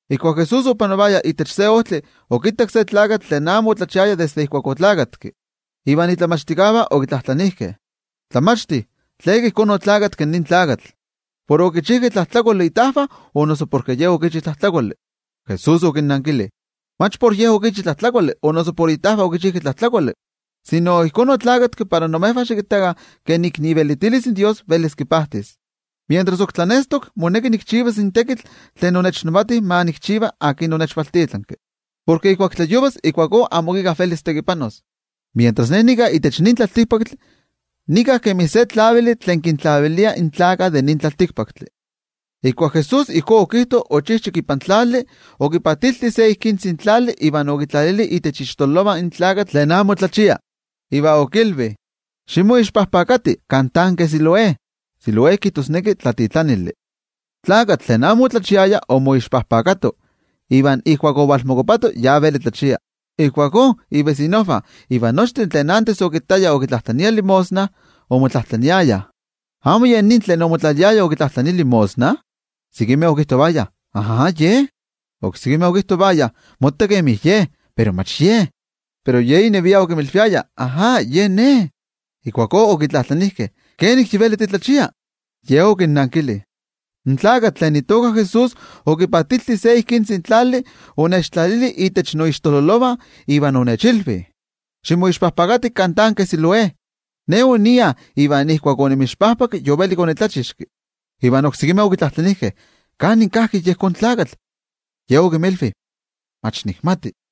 Ijkuak Jesús opanovaya itech se ojtli, okittak se tlakatl tlen amo otlachiaya desde oneski. Iva in momachtijkeh okitlajtlanijkeh: —Tlamachti, ¿tleka ijkó oneski nin tlakatl? ¿Por okichijkeh tlajtlakoli itajvah, o noso porke ye okichi tlajtlakoli? Jesús okinnankili: —Mach por ye okichi tlajtlakoli o noso por itajvah okichijkeh tlajtlakoli, sino ijkó oneski para xikittakah kenomi ivelitilis in Dios velis kipajtis. Mientras ok tlanestok, moneki tikchivaskeh in tekitl tlen noTajtzi onechvaltitlanki ma nikchiva, porke ijkuak tlayovas ijkuakó amo ok íkka velis tekipanos. Mientras Ne nika itech nin tlaltikpaktli, nika kemi se tlavili tlen kintlavilia in tlaltikpaktlakah. Ijkuak Jesús ijkó okijto, ochijchak ipan tlali, okipaatilti se tzikitzi tlali, iva okitlalili itech ixtololovah in tlakatl tlen amo tlachia, iva okilvi: —Ximixamiti kan tanke Siloé —Siloé kijtosneki Tlatitlanili. In tlakatl tlen amo otlachiaya omixamito, iva ijkuak ovalmokuapato, yi veli tlachia. Ijkuakó ivesinojvah iva nochtin tlen achto okittayah okitlajtlania limosna, omotlajtlaniayah: —¿Amo yen nin tlen omotlaliaya okitlajtlania limosna? Sekimeh okijtovayah: —Ajá ye. Oksekimeh okijtovayah: —Motta kemi ye, pero mach ye. Pero ye inevia okinmilviaya: —Ajá, ne. Ijkuakó okitlajtlanijkeh: —¿Kenik yi veli titlachia? Ye okinnankili: —In tlakatl tlen itoka Jesús, okipaatilti se tzikitzi tlali, onechtlalili itech noixtololovah iva onechilvi: “Ximixamiti kan tanke Siloé.” Ne onia iva ijkuak onimixami, yovelik onitlachixki. Iva oksemi okitlajtlanijkeh: —¿Kanin kajki yejón tlakatl? Ye okinmilvi: —Mach nikmati.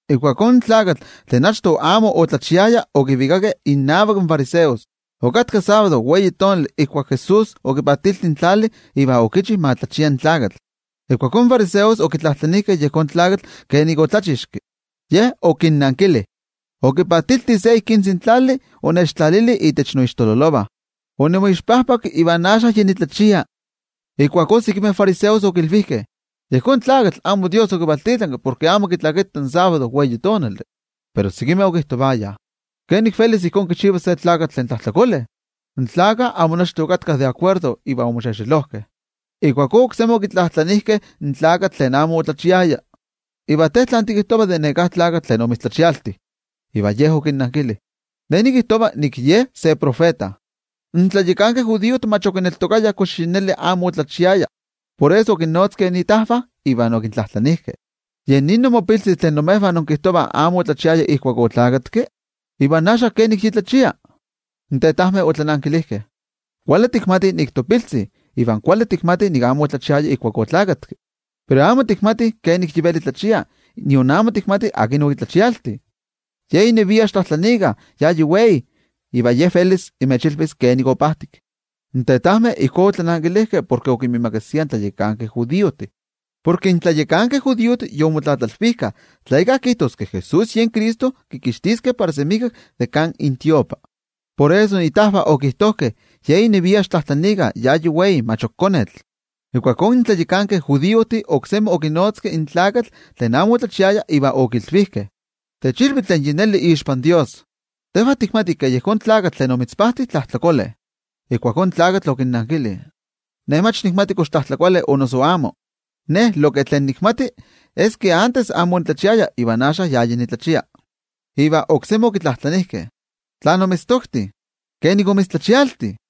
Ijkuakó in tlakatl tlen achto amo otlachiaya okivikakeh innavak in fariseos. Okatka sábado ijkuak Jesús okipaatilti in tlali iva okichi ma tlachia in tlakatl. Ijkuakó in fariseos okitlajtlanijkeh yejón tlakatl kenik otlachixki. Ye okinnankili: —Okipaatilti se tzikitzi tlali, onechtlalili itech noixtololovah, onimixami, iva axka yi nitlachia. Ijkuakó sekimeh fariseos okilvijkeh: —Yejón tlakatl amo Dios okivaltitlanki, porke amo kitlakita in sábado. Pero oksekimeh okijtovayah: —¿Kenik velis ijkó kichivas se tlakatl tlen tlajtlakole? Amo nochtin okatkah de akuerdo iva omoxexelojkeh. Ijkuakó oksemi okitlajtlanijkeh in tlakatl tlen amo otlachiaya: —¿Iva te tlán tikijtova de neká tlakatl tlen omitztlachialti? Iva ye okinnankili: —Ne nikijtova ke Ye se tiotenejmachti. In tlayakankeh judiojtih mach okineltokayah kox yi neli amo otlachiaya. Por eso okinnotzkeh itajvah, iva okintlajtlanijkeh: —¿Yen nin imopiltzi tlen imejvah inkijtovah amo otlachiaya ijkuak oneski? ¿Iva axka kenik yi tlachia? In tetajmeh otlanankilijkeh: —Kuali tikmatih nik topiltzi, iva kuali tikmatih nik amo otlachiaya ijkuak oneski. Pero amo tikmatih kenik yi veli tlachia iva nion amo tikmatih akin okitlachialti. Ye inevia xiktlajtlaniikah, ya yi wei, ye velis imechilvis kenik opajtik. In tetajmeh ijkó otlanankilijkeh porke okinmiimakasiah in tlayakankeh judiojtih. Porke in tlayakankeh judiojtih yomotlatlalvijkah tla íkka kijtos ke Jesús yen Cristo, kikixtiskeh para semijkak de kan intiotlamachtijkal. Por eso itajvah okijtojkeh: “Ye inevia xiktlajtlaniikah, ya yi wei, mach ok konetl.” Ijkuakó in tlayakankeh judiojtih oksemi okinotzkeh in tlakatl tlen amo otlachiaya, iva okilvijkeh: —Techilvi tlen yi neli ixpan Dios. Tejvah tikmatih ke yejón tlakatl tlen omitzpajti, tlajtlakole. Ijkuakó in tlakatl okinnankili: —Ne mach nikmati kox tlajtlakole o noso amo. Lo ke tlen nikmati, es ke achto amo onitlachiaya iva axka ya yi nitlachia. Iva oksemi okitlajtlanijkeh: —¿Tlán omitztokti? ¿Kenik omitztlachialti?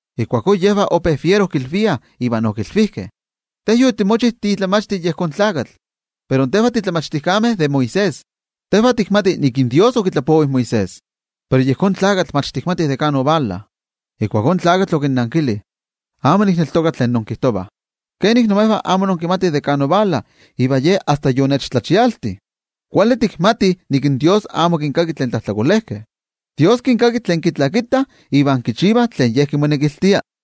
Ijkuakó yejvah ope fiero kilviah, iva okilvijkeh: —Te yotimochi timomachti de yejón tlakatl, pero tejvah timomachtijkeh de Moisés. Tejvah tikmatih nik in Dios okitlapovi in Moisés. Pero yejón tlakatl, mach tikmatih de kan ovala. Ijkuakó in tlakatl okinnankili: —Amo nikneltoka tlen inkijtovah. Kenik imejvah amo inkimatih de kan ovala, iva ne asta yonechtlachialti. Kuali tikmatih nik in Dios amo kinkaki tlen tlajtlakolejkeh. Dios kinkaki tlen kitlakitah iva kichivah tlen Ye kimonekiltia.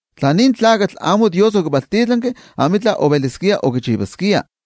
Tla nin tlakatl amo Dios okivaltitlanki, amitla oveliskia okichivaskia.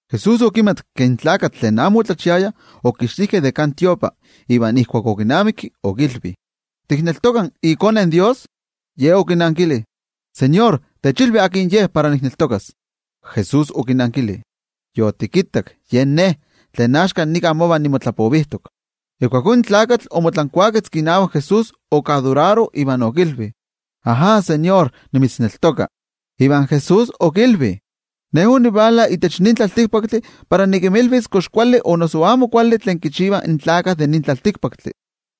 Jesús okimatki ke in tlakatl tlen amo otlachiaya okixtijkeh de kan tiotlamachtijkali, iva ijkuak okinamikki okilvi: —¿Tikneltoka iKone in Dios? Ye okinankili: —Tejwatzi, techilvi akin Ye para nikneltokas. Jesús okinankili: —Yotikittak, yen Ne, tlen axka nika mova nimotlapovijtok. Ijkuakó in tlakatl omotlankuaketzki inavak Jesús, okimavistili iva okilvi: —Ajá, noTeko, nimitzneltoka. Iva Jesús okilvi: —Ne onivala itech nin tlaltikpaktli para nikinmilvis kox kuali o noso amo kuali tlen kichivah in tlaltikpaktlakah.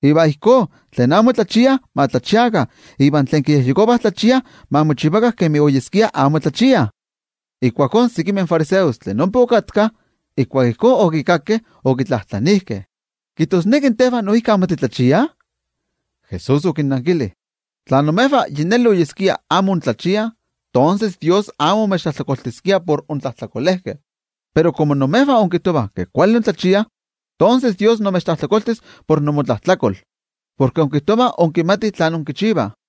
Iva ijkó, tlen amo tlachiah ma tlachiakah iva tlen tlachiah ayakmo ma tlachiakah. Ijkuakó sekimeh fariseos tlen ompa okatkah, ijkuak ijkó okikakkeh okitlajtlanijkeh: —¿Kijtosneki tejvah noijki amo titlachiah? Jesús okinnankili: —Tla imejvah yi neli oyeskia amo intlachiah, tonses Dios amo omechtlajtlakoltiskia por yen inmotlajtlakol. Pero komo imejvah inkijtovah ke kuali intlachiah, tonses Dios imechtlajtlakoltis por yen inmotlajtlakol porke inkijtovah inkimatih tlen inkichivah.